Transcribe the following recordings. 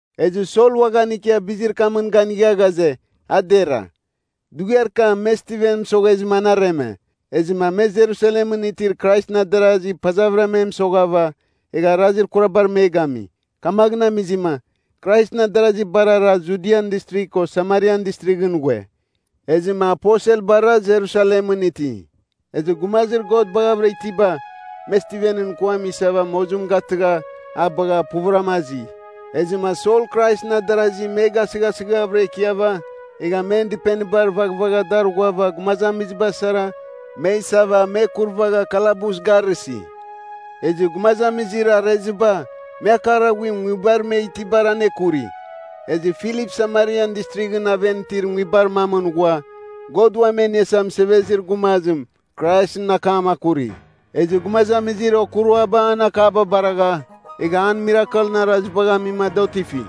Ezɨ Sol uaghan ikia bizir kamɨn ganigha ghaze, a dera. Dughiar kam me Stiven mɨsoghezɨma an areme. Ezɨma me Jerusalemɨn itir Kraisɨn adarasi pazavɨra me mɨsoghava, egha arazir kurabar me gami. Kamaghɨn amizɨma, Kraisɨn adarasi bar ara Judian Distrigh ko Samarian Distrighɨn ghue. Ezɨma aposelbara Jerusalemɨn iti. Ezɨ gumazir God baghavɨra itiba, me Stivenɨn kuam isava mozim gatɨgha a bagha puvɨra azi. Ezɨma Sol Kraisɨn adarasi me gasɨghasɨghavɨra ikiava, egha men dɨpenibar vaghvagha dar ghuava gumazamiziba sara me isava me kurvagha kalabus garɨsi. Ezɨ gumazamizir areziba, me akar aghuim nguibar me itibar anekuri. Ezɨ Filip Samarian Distrighɨn aven itir nguibar mamɨn ghua, God Uam E Iniasa Mɨsevezir Gumazim, Kraisɨn akam kuri. Ezɨ gumazamizir okuruaba an akaba baragha, egha a mirakelɨn arazibagh amima da otifi,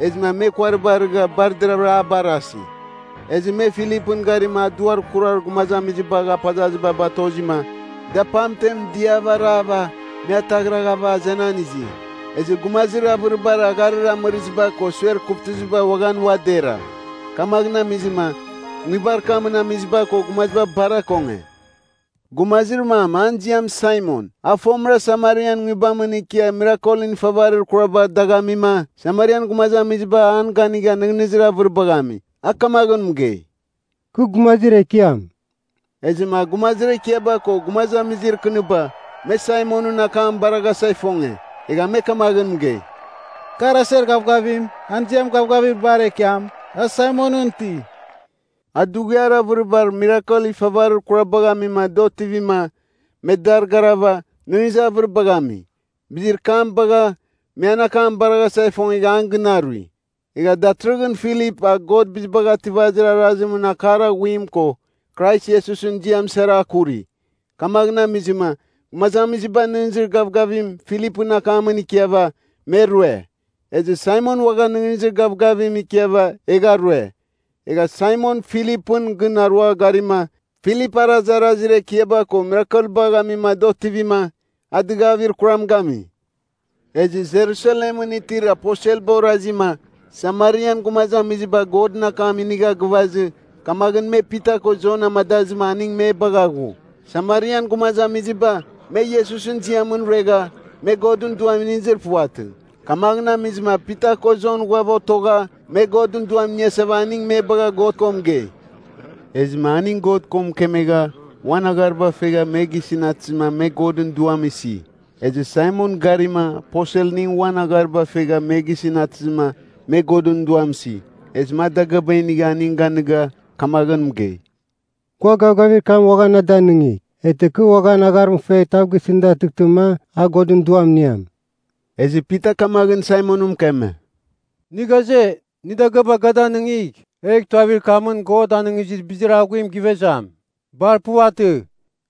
ezɨma me kuariba arigha bar deravɨra a barasi. Ezɨ me Filipɨn garima a duar kurar gumazamizibagh apazaziba batozima, da pamtem diava arava me ataghraghava azenan izi. Ezɨ gumazir avɨribar agharir amɨrɨziba ko suer kuvtɨziba uaghan ua dera. Kamaghɨn amizɨma, nguibar kamɨn amiziba ko gumaziba bar akonge. Gumazir mam an ziam Saimon, a fomɨra Samarian nguibamɨn ikia mirakelɨn ifavarir kuraba dagh amima, Samarian gumazamiziba an ganigha nɨghnɨzir avɨribagh ami. A kamaghɨn mɨgei, “Kɨ gumazir ekiam.” Ezɨma gumazir ekiaba ko gumazamizir kɨniba, me Saimonɨn akam baraghasa ifonge. Egha me kamaghɨn mɨgei, “Kar aser gavgavim, an ziam Gavgavir Bar Ekiam, a Saimonɨn iti.” A dughiar avɨribar mirakel ifavarir kurabagh amima da otivima me dar garava, nɨghnɨzir avɨribagh ami. Bizir kam bagha, me an akam baraghasa ifongegha an gɨn arui. Egha datɨrɨghɨn Filip, a God Bizibagh Ativir Arazimɨn akar aghuim ko Krais Iesusɨn ziam sara akuri. Kamaghɨn amizɨma, gumazamiziba nɨghnɨzir gavgavim Filipɨn akamɨn ikiava, me rue. Ezɨ Saimon uaghan nɨghnɨzir gavgavim ikiava egha rue. Egha Saimon Filipɨn gɨn arua garima, Filip arazarazir ekiaba ko mirakelbagh amima da otivima, a dɨgavir kuram gami. Ezɨ Jerusalemɨn itir aposelba orazima, Samarian gumazamiziba Godɨn akam inigha gɨvazɨ, kamaghɨn me Pita ko Jon amadazɨma aning me bagha ghu. Samarian gumazamiziba, me Iesusɨn ziamɨn ruegha, me Godɨn Duam inizir puvatɨ. Kamaghɨn amizɨma Pita ko Jon ghuava otogha me Godɨn Duam iniasava aning me bagha God ko mɨgei, Ezɨma aning God ko mɨkemegha, uan aghariba fegha me gisɨn atɨzɨma me Godɨn Duam isi. Ezɨ Saimon garima, aposelning uan aghariba fegha me gisɨn atɨzɨma me Godɨn Duam isi. Ezɨma a dagɨaba inigha aning ganɨga, kamaghɨn mɨgei, “Gua gavgavir kam uaghan na danɨngigh. Eghtɨ kɨ uan agharim fegh tav gisɨn datɨghtɨma, a Godɨn Duam iniam.” Ezɨ Pita kamaghɨn Saimon mɨkeme, “Nɨ ghaze, nɨ dagɨaba ga danɨngigh, egh tuavir kamɨn God anɨngizir bizir aghuim givezam. Bar puvatɨ!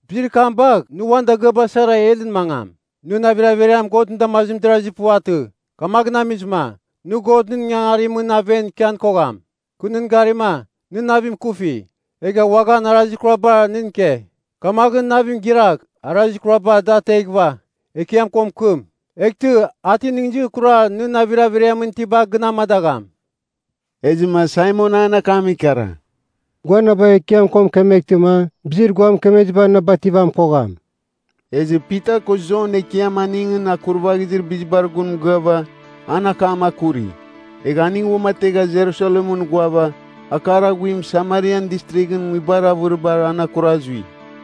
Bizir kam bagh nɨ uan dagɨaba sara helɨn mangam. Nɨn navir averiam Godɨn damazimɨn derazir puvatɨ. Kamaghɨn amizɨma, nɨ Godɨn ingangarimɨn aven ikian kogham. Kɨ nɨn garima, nɨ navim ikufi, egha uaghan arazir kuraba nɨn ike. Kamaghɨn navim gɨragh arazir kuraba da ateghɨva, Ekiam ko mɨkɨm. Eghtɨ a ti nɨghnɨzir kurar nɨn navir averiamɨn itiba gɨn amadagham.” Ezɨma Saimon an akam ikara, “Gua na bagh Ekiam ko mɨkɨmtɨma, bizir gua mɨkemeziba na bativan kogham.” Ezɨ Pita ko Jon Ekiam aningɨn akurvaghizir bizibar gun mɨgɨava, an akam akuri. Egha aning uamategha Jerusalemɨn ghuava, akar aghuim Samarian Distrighɨn nguibar avɨribar an akura zui.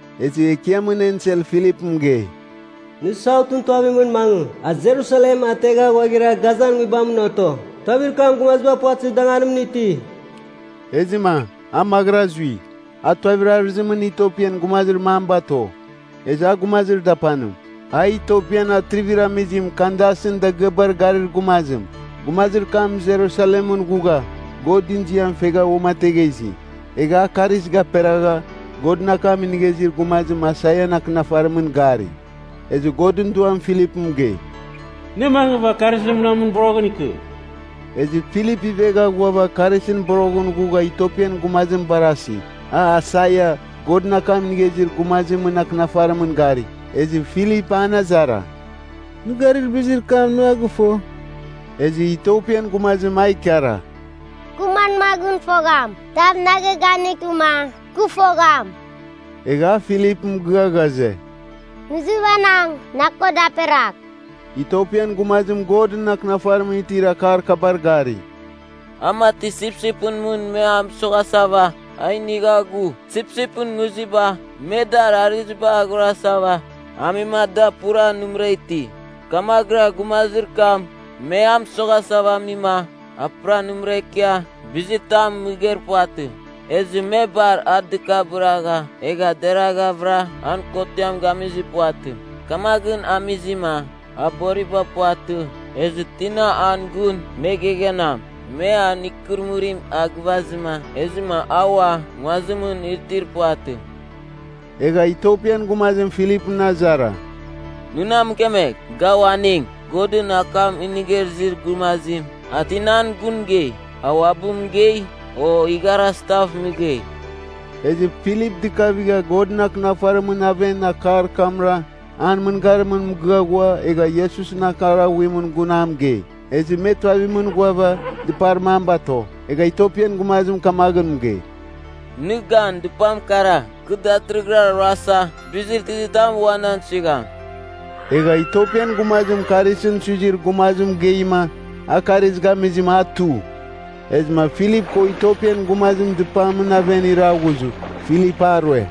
Ezɨ Ekiamɨn ensel Filipɨn mɨgei, “Nɨ Sautɨn tuavimɨn mangɨ, a Jerusalem ategha ghuaghira Gazan nguibamɨn oto. Tuavir kam gumaziba puvatɨzir danganimɨn iti.” Ezɨma, a maghɨra zui, a tuavir arɨzimɨn Itiopian gumazir mam bato. Ezɨ a gumazir dapanim, a Itiopian atrivir amizim Kandasɨn dagɨabar garir gumazim. Gumazir kam Jerusalemɨn ghugha Godɨn ziam fegha uamategha izi. Egha a karis gaperagha, Godɨn akam inigha izir gumazim, Aisaian akɨnafarimɨn gari. Ezɨ Godɨn Duam Filip mɨgei, “Nɨ mangɨva karisɨn munamɨn boroghɨn ikɨ.” Ezɨ Filip ivegha ghuava karisɨn boroghɨn ghugha Itiopian gumazim barasi, a Aisaia, Godɨn akam inigha izir gumazimɨn akɨnafarimɨn gari. Ezɨ Filip an azara, “Nɨ garir bizir kam nɨ a gɨfo?” Ezɨ Itiopian gumazim a ikara, “Kɨ manmaghɨn fogham? Tav na geghanɨghtɨma, kɨ fogham.” Egha a Filip mɨgɨa ghaze, “Nɨ izɨvanang na ko daperagh.” Itiopian gumazim Godɨn Akɨnafarimɨn itir akar kabar gari, “A mati sipsipɨn mɨn me a mɨsoghasava, a inigha ghu. Sipsipɨn nguziba, me dar arɨziba aghorasava amima da pura nɨmɨra iti. Kamaghɨra gumazir kam, me a mɨsoghasava amima, a pura nɨmɨra ikia bizitam mɨgeir puvatɨ. Ezɨ me bar a dɨkabɨragha, egha deraghavɨra an kotiam gamizir puvatɨ. Kamaghɨn amizɨma, a boriba puvatɨ, ezɨ tina an gun me geghanam? Me an ikɨrɨmɨrim a gɨvazɨma, ezɨma a ua nguazimɨn itir puvatɨ.” Egha Itiopian gumazim Filipɨn azara, “Nɨ na mɨkemegh, ga uaning, Godɨn akam inigha izir gumazim, a tinan gun mɨgei? A uabɨ mɨgei, o igharazitav mɨgei?” Ezɨ Filip dɨkavigha Godɨn Akɨnafarimɨn aven akar kamra an mɨngarimɨn mɨgɨa ghua, egha Iesusɨn akar aghuimɨn gun a mɨgei. Ezɨ me tuavimɨn ghuava, dɨpar mam bato. Egha Itiopian gumazim kamaghɨn mɨgei, “Nɨ gan, dɨpam kara. Kɨ datɨrɨghɨra ruasa, bizir tizitam ua nan suigham?” Egha Itiopian gumazim karisɨn suizir gumazim mɨgeima, a karis gamizɨma a tu. Ezɨma Filip ko Itiopian gumazim dɨpamɨn aven iraghughzɨ, Filip a rue.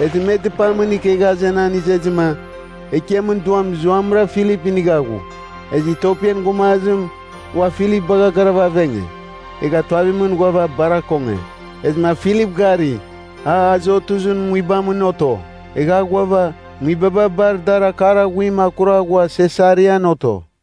Ezɨ me dɨpamɨn ikegha azenan izezɨma, Ekiamɨn Duam zuamɨra Filip inigha ghu. Ezɨ Itiopian gumazim ua Filip bagha garava avenge, egha tuavimɨn ghuava bar akonge. Ezɨma Filip gari, a Azotuzɨn nguibamɨn oto. Egha a ghuava, nguibaba bar dar akar aghuim akura ghua Sesarian oto.